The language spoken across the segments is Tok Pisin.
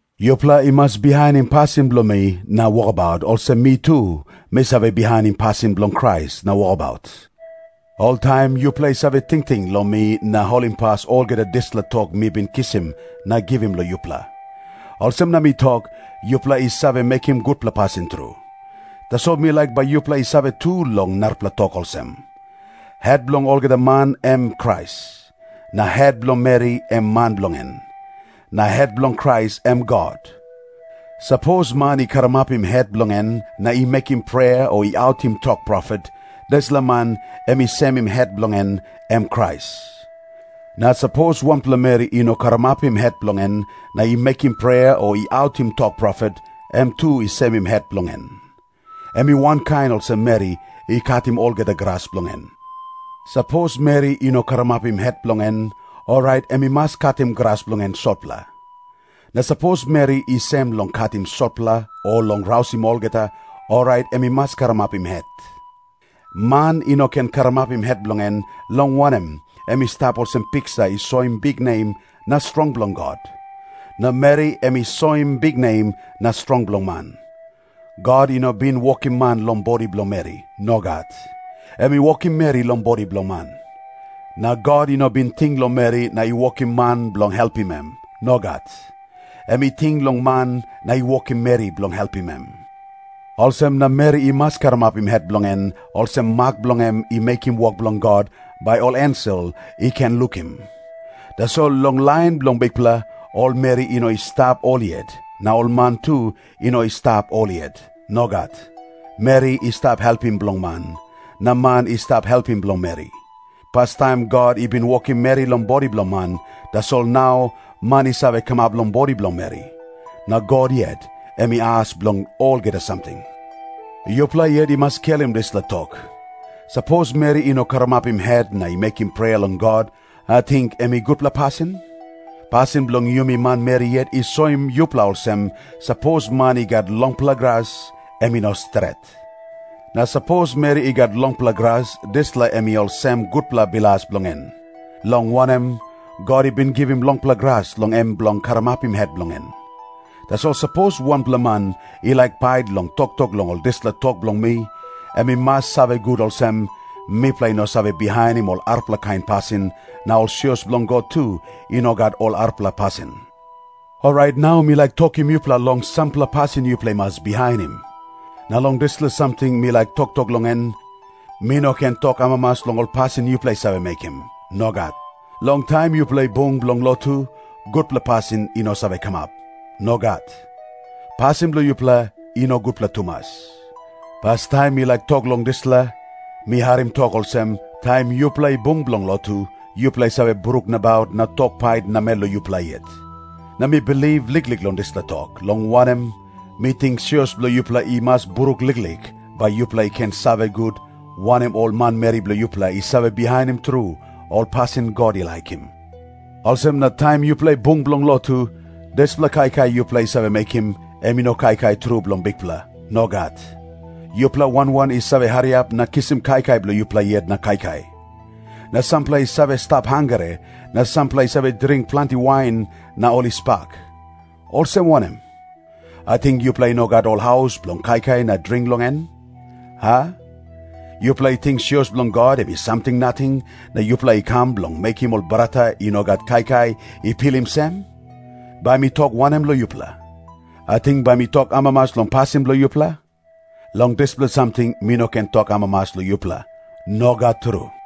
Yupela i mas bihainim pasin bilong mi na wokabaut, olsem mi tu mi save bihainim pasin bilong Krais na wokabaut. Oltaim yupela i save tingting long mi na holimpas olgeta dispela tok mi bin kisim na givim long yupela. Olsem na mi tok, yupela i save mekim gutpela pasin tru. Tasol mi laik bai yupela i save tu long narapela tok olsem. Het bilong olgeta man em Krais, na het bilong meri em man bilong en, na het bilong Krais em God. Sapos man i karamapim het bilong en na i mekim prea o i autim tok profet, dispela man em i semim het bilong en, em Krais. Na sapos wanpela meri i no karamapim het bilong en na i mekim prea o i autim tok profet, em tu i semim het bilong en. Em i wankain olsem meri i katim olgeta gras bilong en. Sapos meri i no karamapim het bilong en, orait em i mas katim gras bilong en sotpela. Na sapos meri i sem long katim sotpela o long rausim olgeta, orait em i mas karamapim het. Man i no ken karamapim het bilong en, long wanem, em i stap olsem piksa i soim biknem na strong bilong God. Na meri em i soim biknem na strong bilong man. God i no bin wokim man long bodi bilong meri. Nogat. Em i wokim meri long bodi bilong man. Na God i no bin ting long meri na i wokim man bilong helpim em. Nogat. Em i ting long man na i wokim meri bilong helpim em. Olsem na meri i mas karamapim het bilong en olsem mak bilong em i mekim wok bilong God, bai ol ensel i ken lukim. Tasol long lain bilong Bikpela, ol meri i no i stap ol yet, na ol man tu i no i stap ol yet. Nogat. Meri i stap helpim bilong man, na man i stap helpim bilong meri. Pastaim God i bin wokim meri long bodi bilong man, tasol nau man i save kamap long bodi bilong meri. Na God yet em i as bilong olgeta samting. Yupela yet i mas skelim dispela tok. Sapos meri i no karamapim het na i mekim prea long God, ating em i gutpela pasin? Pasin bilong yumi manmeri yet i soim yupela olsem, sapos man i gat longpela gras, em i no stret. Na sapos meri i gat longpela gras, dispela em i olsem gutpela bilas bilong en. Long wanem, God i bin givim longpela gras long em bilong karamapim het bilong en. Tasol sapos wanpela man i laik pait long toktok long ol dispela tok bilong mi, em i mas save gut olsem, mipela i no save bihainim ol arapela kain pasin, na ol sios bilong God tu i no gat ol arapela pasin. Orait nau mi laik tokim yupela long sampela pasin yupela i mas bihainim. Na long dispela samting mi laik toktok long en, mi no ken tok amamas long ol pasin yupela i save mekim. Nogat. Long taim yupela i bung bilong lotu, gutpela pasin i no save kamap. Nogat. Pasin bilong yupela i no gutpela tumas. Pastaim mi laik tok long dispela. Mi harim tok olsem, taim yupela i bung bilong lotu, yupela i save bruk nabaut na tok pait namel long yupela yet. Na mi bilip liklik long dispela tok, long wanem, mi ting sios bilong yupela i mas bruk liklik, bai yupela i ken save gut, wanem ol manmeri bilong yupela i save bihainim tru ol pasin God i laikim. Olsem na taim yupela i bung bilong lotu, dispela kaikai yupela i save mekim, em i no kaikai tru bilong Bikpela. Nogat. Yupela wan wan i save hariap na kisim kaikai bilong yupela yet na kaikai. Na sampela i save stap hangre, na sampela i save dring planti wain na ol i spak. Olsem wanem? Ating yupela i no gat ol haus bilong kaikai na dring long en, a? Yupela i ting sios bilong God em i samting nating, na yupela i kam bilong mekim ol brata i no gat kaikai i pilim sem? Bai mi tok wanem long yupela? Ating bai mi tok amamas long pasin bilong yupela? Long dispela samting mi no ken tok amamas long yupela. Nogat tru.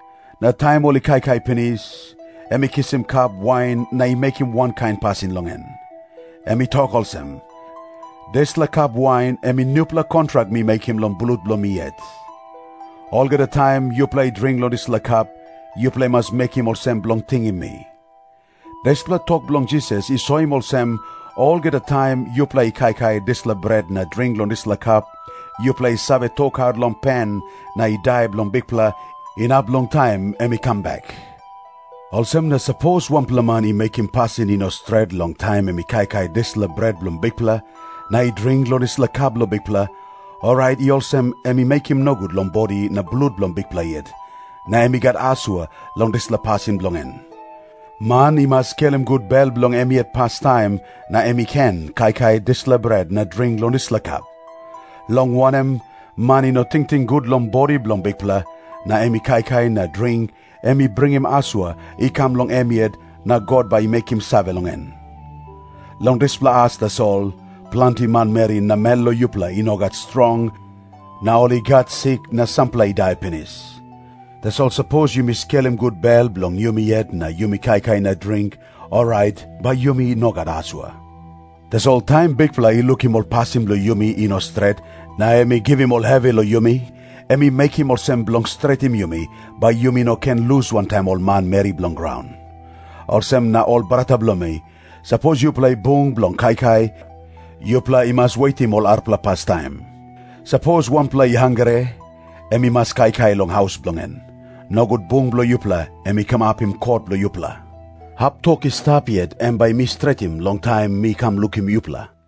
Na taim ol i kaikai pinis, em i kisim kap wain na i mekim wankain pasin long en. Em i tok olsem, “Dispela kap wain em i nupela kontrak mi mekim long blut bilong mi yet. Olgeta taim yupela i dring long dispela kap, yupela i mas mekim olsem bilong tingim mi.” Dispela tok bilong Jisas i soim olsem, olgeta taim yupela i kaikai dispela bret na dring long dispela kap, yupela i save tokaut long pen na i dai bilong Bikpela, inap long taim em i kam bek. Olsem na sapos wanpela man i mekim pasin i no stret long taim em i kaikai dispela bret bilong Bikpela na i dring long dispela kap bilong Bikpela, orait i olsem em i mekim nogut long bodi na blut bilong Bikpela yet, na em i gat asua long dispela pasin bilong en. Man i mas skelim gut bel bilong em yet pastaim, na em i ken kaikai dispela bret na dring long dispela kap. Long wanem, man i no tingting gut long bodi bilong Bikpela, na em i kaikai na dring, em i bringim asua i kam long em yet, na God bai i mekim save long en. Long dispela as tasol, planti manmeri namel long yupela i no gat strong na ol i gat sik na sampela i dai pinis. Tasol sapos yumi skelim gut bel bilong yumi yet na yumi kaikai na dring, orait bai yumi no gat asua. Tasol taim Bikpela i lukim ol pasin bilong yumi i no stret na em i givim ol hevi long yumi, em i mekim olsem bilong stretim yumi, bai yumi no ken lus wantaim ol manmeri bilong graun. Olsem na, ol brata bilong mi, sapos yupela i bung bilong kaikai, yupela i mas wetim ol arapela pastaim. Sapos wanpela i hangre, em i mas kaikai long haus bilong en. Nogut bung bilong yupela em i kamapim kot bilong yupela. Hap tok i stap yet, em bai mi stretim long taim mi kam lukim yupela.